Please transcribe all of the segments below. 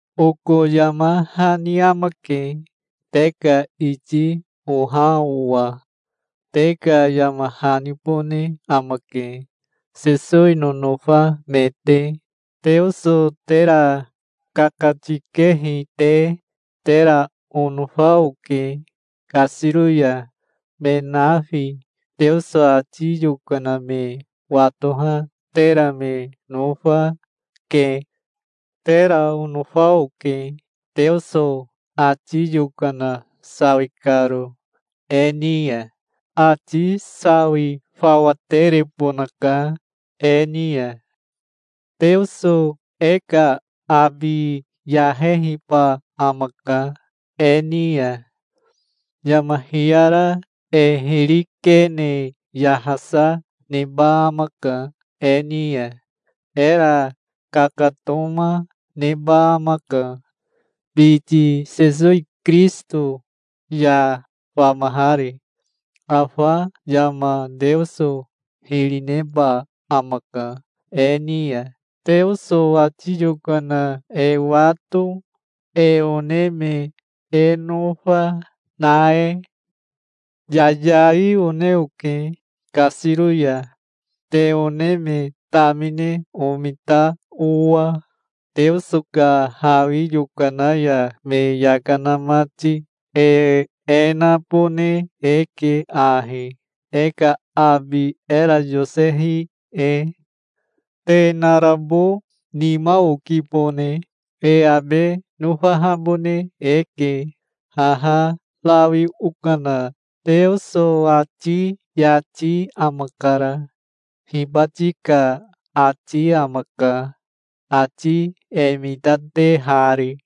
Oko yama hani amake, te ka iti oha owa. Te ka yama hanibone amake, Sesowi nonofa me te, Teoso tera kakatikehi te. Tera onofa oke kasiro ya. Me nafi Teoso ati yokana me watoha tera me nofa, ke. Tera onofa oke, Teoso ati yokana sawi karo e ni ya. Ati sawi fawa terebonaka e ni ya. Teoso e ka abi yahehiba amaka e ni ya. Yama hiyara e hiri kene yahasa neba amaka e ni ya. Era kakatoma neba amaka, biti Sesowi Kirisito ya famahari. Afa yama Teoso hiri neba amaka e ni ya, Teoso ati yokana e wato, e one me e nofa, na e. Yayai one oke kasiro ya, te one me tamine omita owa, Teoso ka hawi yokana ya me yaka na mati. E e nabone eke ahi, e ka abi era yosehi e. Te narabo nima okibone. E abe nofahabone eke. Haha rawi okana Teoso ati yati amakara. Hibati ka ati amaka, ati e mitatehari.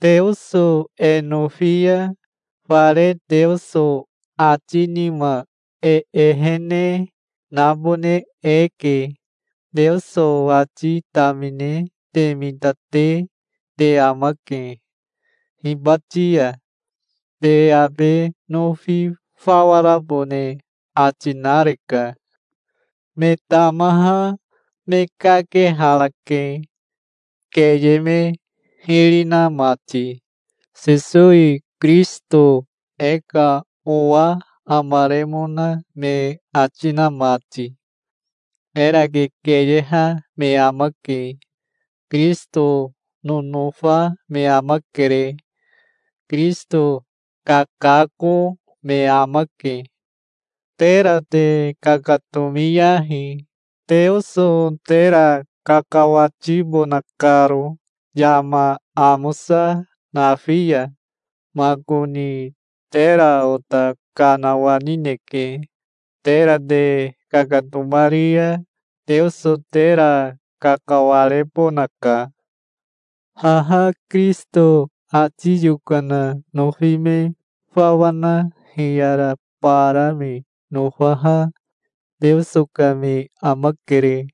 Teoso e nofi ya fare Teoso ati nima e ehene nabone eke. Teoso ati tamine te mitate te amake hibati ya. Te abe nofi fawa rabone ati nareka. Me tamaha me kakeharake, keye me hiri na mati, Sesowi Kirisito e ka owa amaremona me ati na mati. Era kekeyeha me amake. Kirisito nonofa me amakere. Kirisito kakako me amake. Tera te kakatomiyahi, Teoso tera kakawatibona karo yama amosa nafi ya. Makoni tera ota kanawanineke. Tera te kakatomari ya Teoso tera kakawarebonaka. Haha Kirisito ati yokana nofi me fawa na hiyara bara me nofaha Teoso ka me amakere.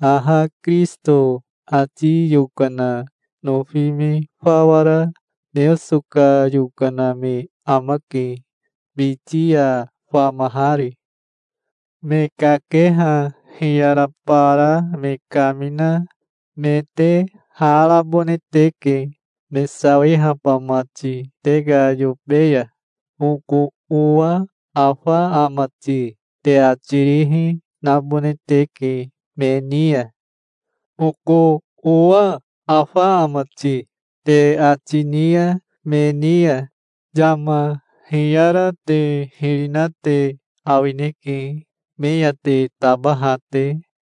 Haha Kirisito ati yokana nofi me fawa ra Teoso ka yokana me amake, biti ya famahari. Me kakeha hiyara bara me kamina me te ha rabone teke, me sawihaba mati te ka yobe ya. "Oko owa afa ama ti?" te ati rihi nabone teke me ni ya. "Oko owa afa ama ti?" te ati ni ya me ni ya, yama hiyara te hiri na te awineke, me ya te tabaha te.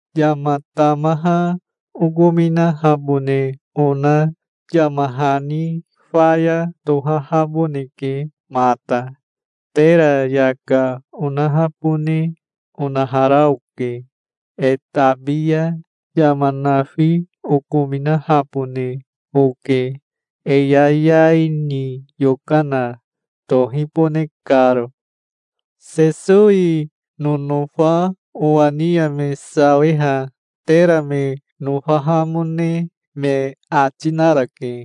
Yama tamaha okominahabone ona yama hani faya tohahaboneke mata. Tera yaka onahabone onahara oke. E tabi ya yama nafi okominahabone oke, e yayai ni yokana tohibone karo. Sesowi nonofa owa ni ya me sawiha tera me nofahamone me ati narake.